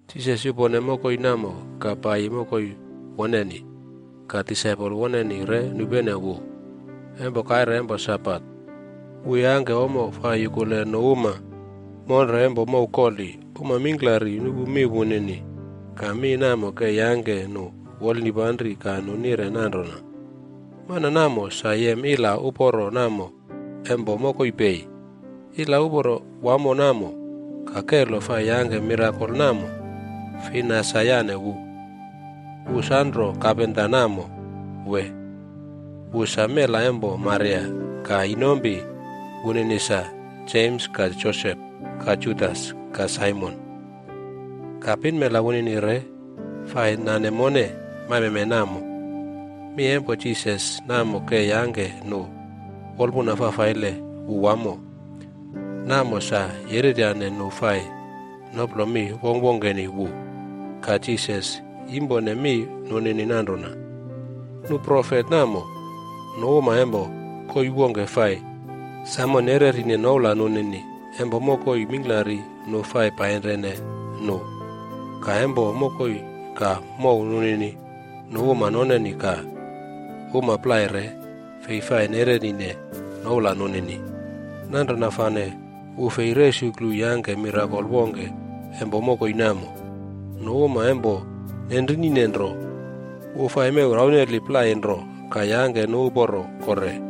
Jisas yupone mokoi namo ka paiyi mokoi woneni. Ka disaipol woneni re nupene wu. Empo kaire empo Sabat, wu yangke ommo fai yukule nu uma monre empo mow koli. Uma mingklari nupu mi wunini, ka mi namo ke yangke nu wolnipanri ka nu nire nanrona, “Mana namo sa yem ila uporo namo empo mokoi pei? Ila uporo wamo namo ka kelo fai yangke mirakol namo, fina sa yane wu? Wu sanro kapenta namo wee? Wu sa mela empo Maria ka inompi wunini sa, Jems ka Josep ka Judas ka Saimon. Ka pinmela wunini re fai nane mone maimeme namo.” Mi empo Jisas namo ke yangke nu wolpuna fafaile wu wamo, namo sa yereryane nu fai noplo mi wongkwongkeni wu. Ka Jisas yimpone mi nunini nanrona, “Nu profet namo, nu uma empo koii wongke fai samo nererine noula nunini empo mokoi mingklari nu fai painrine nu. Ka, empo mokoi ka mow nunini, nu uma noneni ka uma plai re fei fai nererine noula nunini.” Nanrona fane wu fei resuklu yangke mirakol wongke empo mokoi namo. Nu uma empo nenrinine nro, wu fai mew rauneli plai nro ka yangke nu uporo kore.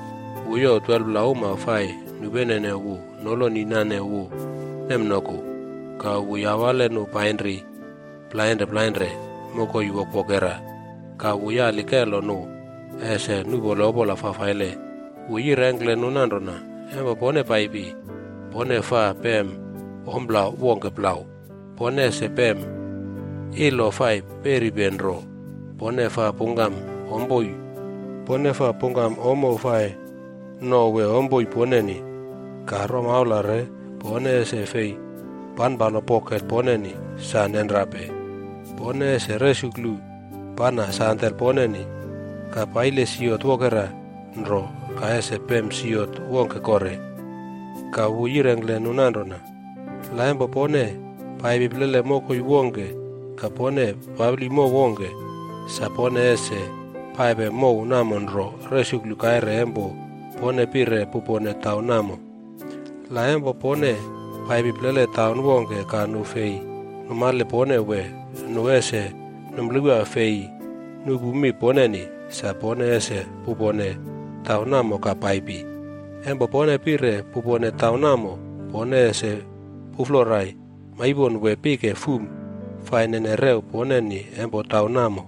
Wu youw 12pla uma fai nupenene wu noloni nane wu nemnoku, ka wu yawale nu painri plainre plainre mokoi wokwokera. Ka wu yali kelo nu ese nuꞌpole opola fafaile. Wu yirengkle nu nanrona, “Empo pone paipi, pone faa pem ompla wongke plau. Pone ese pem ilo fai peripe nro. Pone faa pungkam ommo fai no wee ompoi poneni. Ka romaula re pone ese fei panpalo poket poneni. Sa nenrape! Pone ese resuklu pana sandel poneni, ka paile siot wokera nro ka ese fei pem siot wongke kore.” Ka wu yirengkle nu nanrona, “La empo pone paipi plele mokoi wongke ka pone papli mow wongke, sa pone ese paipe mow namo nro resuklu kaire empo pone pire pupone taun namo. La empo pone paipi plele taun wongke ka nu fei numale pone wee nu ese numplewa fei nupu mi poneni, sa pone ese pupone taun namo ka paipi. Empo pone pire pupone taun namo, pone ese puflorai maipon wee pike fuma fai nene rew poneni empo taun namo.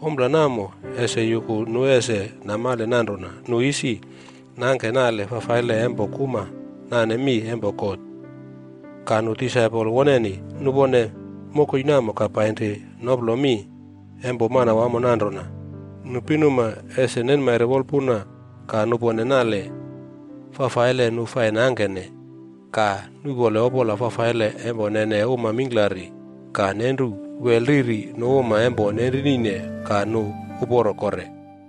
Ompla namo ese yuku nu ese namale nanrona nu isi nangke nale fafaile empo kuma nane mi empo God.” Ka nu disaipol woneni nupone mokoi namo ka painri noplo mi empo Manawamo nanrona, nu pinuma ese nenmaire wolpuna ka nupone nale fafaile nu fai nangkene. Ka nu nuꞌpole opola fafaile empo nene uma mingklari, ka nenru wel riri nu uma empo nenrinine ka nu uporo kore.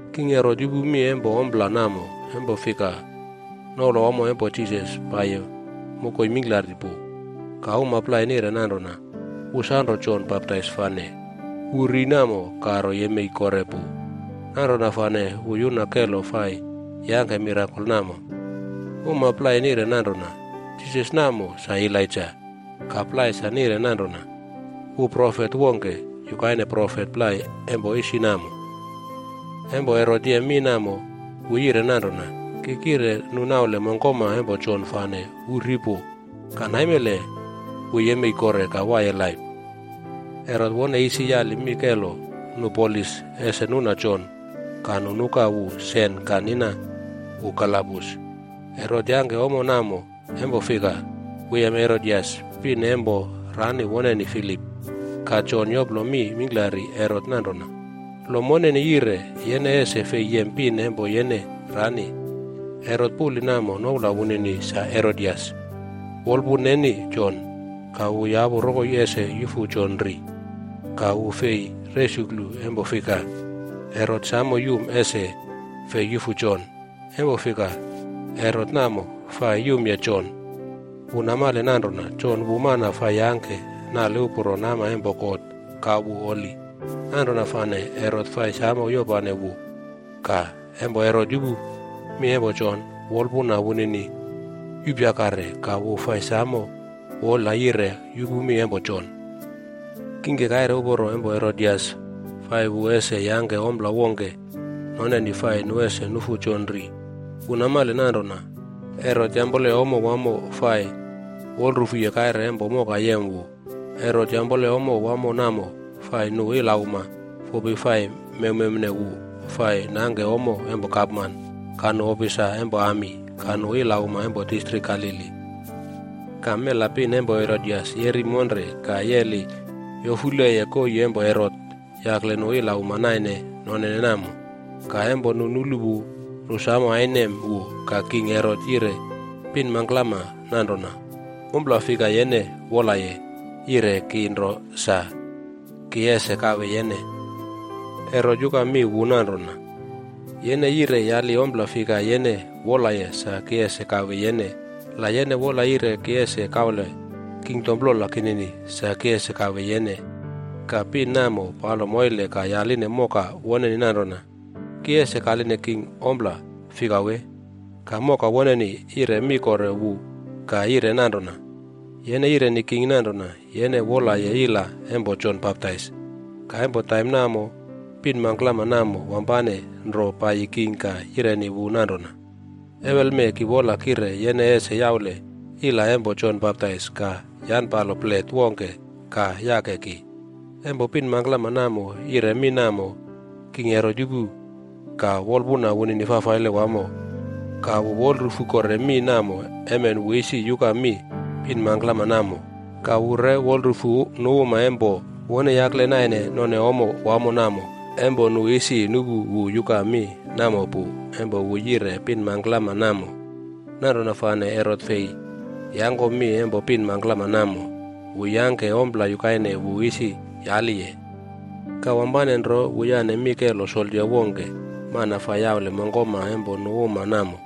King Herot yupu mi empo ompla namo, empo fika, noula wamo empo Jisas paiyi mokoi mingklari pu. Ka uma plai nire nanrona, “Wu sanro Jon Baptais fane, wu ri namo ka ro yemei kore pu. Nanrona fane wu yuna kelo fai yangke mirakol namo.” Uma plai nire nanrona, “Jisas namo sa Elaija.” Ka plai sa nire nanrona, “Wu profet wongke yukaine profet plai empo isi namo.” Empo Herot yem mi namo, wu yire nanrona, “Ki kire nu naule mongkoma empo Jon fane wu ri pu, ka naimele wu yemei kore ka waiye laip!” Herot wone isi yali mi kelo nu polis ese nuna Jon ka nu nuka wu sen ka nina wu kalabus. Herot yangke ommo namo empo fika, wu yem Herodias pin empo rani woneni Filip. Ka Jon yoplo mi mingklari Herot nanrona, “Lo moneni yire, yene ese fei yem pin empo yene rani.” Herot puli namo noula wunini sa Herodias, wolpun neni Jon, ka wu yapu rokoi ese yufu Jon ri. Ka wu fei resuklu empo fika, Herot samo yum ese fei yufu Jon. Empo fika, Herot namo fai yumye Jon. Wu namale nanrona Jon wu mana fai yangke nale uporo nama empo God ka wu holi. Nanrona fane Herot fai samo yopane wu. Ka empo Herot yupu mi empo Jon, wolpuna wunini yupyakare. Ka wu fai samo wolayire yupu mi empo Jon. Kingke, kaire uporo empo Herodias fai wu ese yangke ompla wongke noneni fai ese nu nufu Jon ri. Wu namale nanrona Herot yampole ommo wamo fai wolrufuye kaire empo moka yem wu. Herot yampole ommo wamo namo fai nu ilauma fopi fai mewmewne wu fai nangke ommo empo gapman, ka nu ofisa empo ami, ka nu ilauma empo distrik Galili. Ka mela pin empo Herodias yeri monre ka yeli yofuleye koii empo Herot yakle nu ilauma naine nonene namo. Ka empo nu nulu wu, nu samo ainem wu. Ka king Herot yire pin mangklama nanrona, “Ompla fika yene wolaye, yire ki nro sa ki ese kawe yene.” Herot yuka mi wu nanrona, “Yene yire yali ompla fika yene wolaye sa ki ese kawe yene. La yene wola yire ki ese kaule kingdom plola kinini, sa ki ese kawe yene.” Ka pin namo palo moile ka yaline moka woneni nanrona, “Ki ese kaline king ompla fika wee?” Ka moka woneni yire mi kore wu ka yire nanrona, “Yene yireni king nanrona yene wolaye ila empo Jon Baptais.” Ka empo taim namo, pin mangklama namo wampane nro paiyi king ka yireni wu nanrona, “Ewelme ki wola kire yene ese yaule ila empo Jon Baptais ka yanpalo plet wongke ka yake ki.” Empo pin mangklama namo yire mi namo, king Herot yupu ka wolpuna wunini fafaile wamo. Ka wu wolrufu kore mi namo emen wu isi yuka mi pin mangklama namo, ka wu re wolrufu nu uma empo wone yakle naine none ommo wamo namo empo nu isi nupu wu yuka mi namo pu empo wu yire pin mangklama namo. Nanrona fane Herot fei yangkomi empo pin mangklama namo. Wu yangke ompla yukaine wu isi yaliye. Ka wampane nro wu yane mi kelo soldia wongke, mana fai yaule mongkoma empo nu uma namo,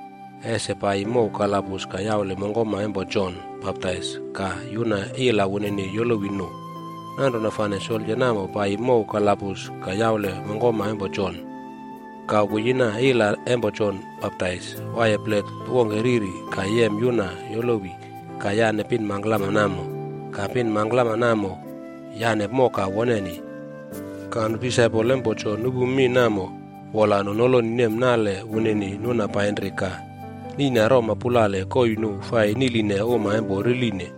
ese paiyi mow kalabus ka yaule mongkoma empo Jon Baptais ka yuna ila wunini yolowi nu. Nanrona fane soldia namo paiyi mow kalabus ka yaule mongkoma empo Jon. Ka wu yina ila empo Jon Baptais waiye plet wongke riri ka yem yuna yolowi ka yane pin mangklama namo. Ka pin mangklama namo yane moka woneni. Ka nu disaipol empo Jon nupu mi namo wola nu noloni nem nale wunini nuna painri ka niꞌna roma pulale koii nu fai niꞌline uma empo riline.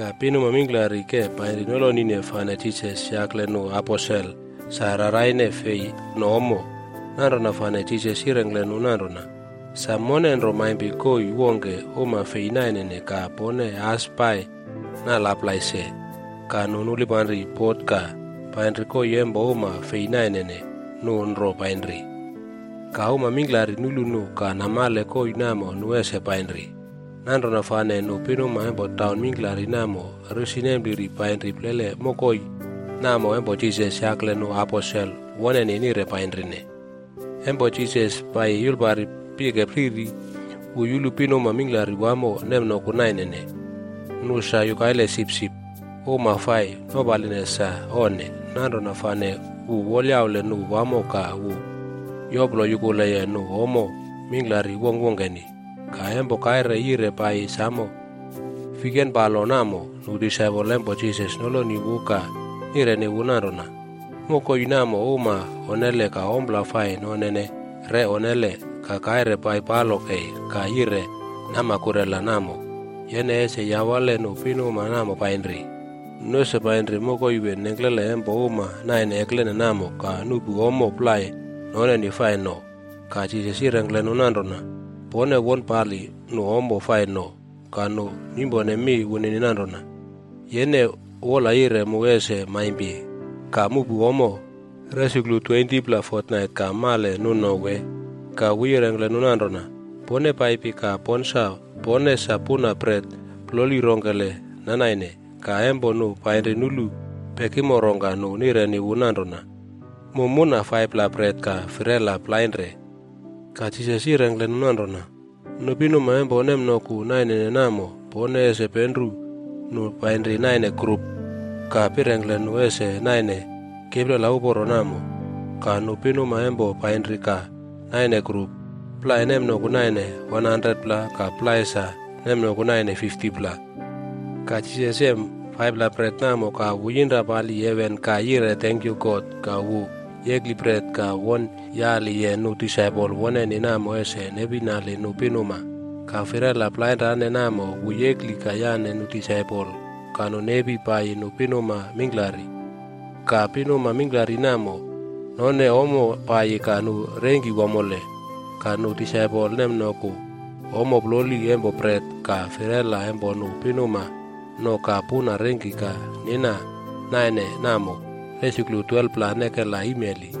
Ka pinuma mingklari ke painri nolonine fane Jisas yakle nu aposel sa raraine fei no ommo. Nanrona fane Jisas yirengkle nu nanrona, “Sa, mone nro maimpi koii wongke uma fei nainene ka pone as pai nalaplai se.” Ka nu nulpanri bot ka painri koii empo uma fei nainene. Nu nro painri. Ka uma mingklari nulu nu ka namale koii namo nu ese painri. Nanrona fane nu pinuma empo taun mingklari namo risi nempliri painri plele mokoi namo empo Jisas yakle nu aposel woneni nire painrine. Empo Jisas paiyi yulpari pike riri, wu yulu pinuma mingklari wamo nemnoku nainene. Nu sa yukaile sipsip, uma fai nopaline sa onne. Nanrona fane wu wolyaule nu wamo ka wu yoplo yukuleye nu ommo mingklari wongkwongkeni. Ka empo kaire yire paiyi samo fiken palo namo nu disaipol empo Jisas noloni wu ka nireni wu nanrona, “Mokoi namo uma onnele ka ompla fai nonene re onnele. Ka kaire paipalo kei ka yire nama kurela namo. Yene ese yawale nu pinuma namo painri. Nu ese painri mokoi wee nengklele empo uma naine eklene namo ka nuꞌpu ommo plai noneni fai no.” Ka Jisas yirengkle nu nanrona, “Pone wone pali nu ommo fai no.” Ka nu nimpone mi wunini nanrona, “Yene wolayire mu ese maimpi ka muꞌpu ommo resuklu 20pla fotnait ka male nu no wee?” Ka wu yirengkle nu nanrona, “Pone paipi ka ponsa pone sa puna bret ploli rongkele nanaine.” Ka empo nu painri nulu pekimo rongka nu nireni wu nanrona, “Mu muna 5pla bret ka firela plainre.” Ka Jisas yirengkle nu nanrona, “Nu pinuma empo nemnoku nainene namo pone ese penru nu painri naine grup, ka pirengkle nu ese naine kiplela uporo namo.” Ka nu pinuma namo painri ka naine grup. Plai nemnoku naine 100pla ka plai sa nemnoku naine 50pla. Ka Jisas yem 5pla bret namo ka wu yinra pali heven ka yire tenkyu God ka wu yekli bret ka won yaliye nu disaipol woneni namo ese nepinali nu pinuma. Ka firela plainre namo, wu yekli ka yane nu disaipol ka nu nepi paiyi nu pinuma mingklari. Ka pinuma mingklari namo none ommo paiyi ka nu rengki wamole. Ka nu disaipol nemnoku ommo ploli empo bret ka firela empo nu pinuma no ka puna rengki ka nina naine namo resuklu 12pla nekela imeli.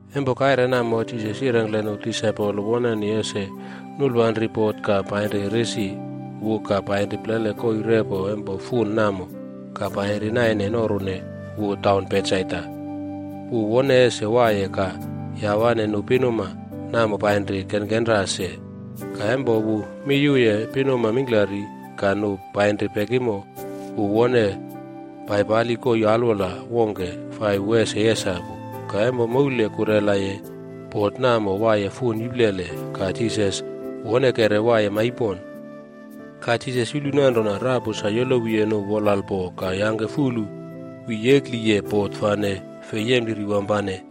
Empo kaire namo, Jisas yirengkle nu disaipol woneni ese nulpanri bot ka painri risi wu ka painri plele koii repo empo fun namo ka painri naine norune wu taun Betsaida. Wu wone ese waiye ka yawane nu pinuma namo painri kenkenra se. Ka empo wu miyuye pinuma mingklari ka nu painri pekimo, wu wone paipali koii alwola wongke fai wu ese yesapu. Ka empo moule kurelaye, bot namo waiye fun iplele ka Jisas wonekere waiye maipon. Ka Jisas yulu nanrona rapu sa yolowiye nu wolalpo ka yangke fulu wi yekliye bot fane fei yempliri wampane.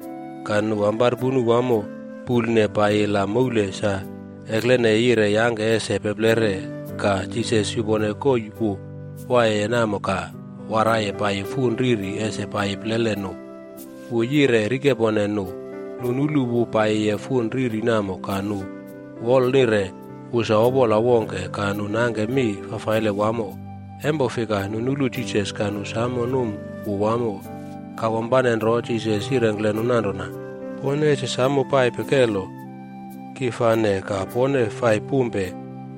Ka nu amparpunu wamo pulne paiyila moule sa ekleneye yire yangke ese peplere. Ka Jisas yupone koii wu waiye namo ka waraiye paiyi fun riri ese paiyi plele nu. Wu yire rikepone nu. Nu nulu wu paiyiye fun riri namo ka nu wolnire wu sa opola wongke, ka nu nangke mi fafaile wamo. Empo fika nu nulu Jisas ka nu samo num wu wamo. Ka wampane nro Jisas yirengkle nu nanrona, “Pone ese samo paipe kelo! Ki fane ka pone fai pumpe.”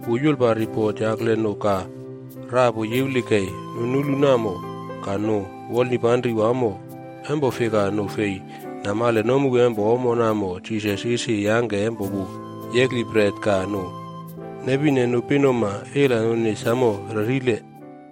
Wu yulpari bot yakle nu ka rapu yiwli kei. Nu nulu namo ka nu wolnipanri wamo. Empo fika nu fei namale nomu empo ommo namo Jisas isi yangke empo wu yekli bret ka nu nepine nu pinuma.c Ila nunini samo relile.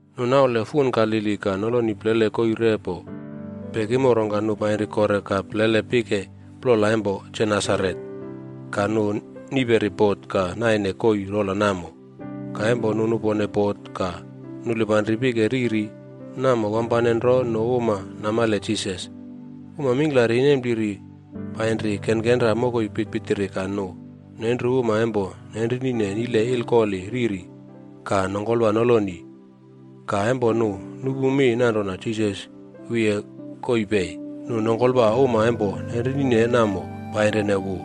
Nu naule fun Galili ka noloni plele koii repo pekimo, rongka nu painri kore ka plele pike plola empo Genesaret. Ka nu niperi bot ka naine koii rola namo. Ka empo nu nupone bot ka nulpanri pike riri namo, wampane nro nu uma namale Jisas. Uma mingklari nempliri painri kenkenra mokoi pitpitiri ka nu nenru uma empo nenrinine nile ilkoli riri ka nongkolwa noloni. Ka empo nu nupu mi nanrona Jisas wiye koii pei, nu nongkolwa uma empo nenrinine namo painrine wu.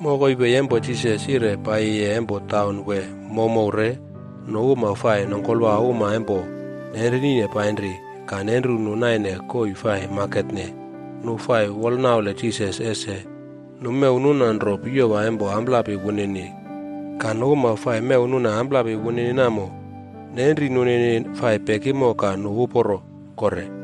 Mokoi pei empo Jisas yire paiyiye empo taun wee mowmow re nu uma fai nongkolwa uma empo nenrinine painri ka nenru nu naine koii fai maketne. Nu fai wolnaule Jisas ese nu mew nuna nro piyowa empo amplapi wunini. Ka nu uma fai mew nuna amplapi wunini namo, nenri nunini fai pekimo ka nu uporo kore.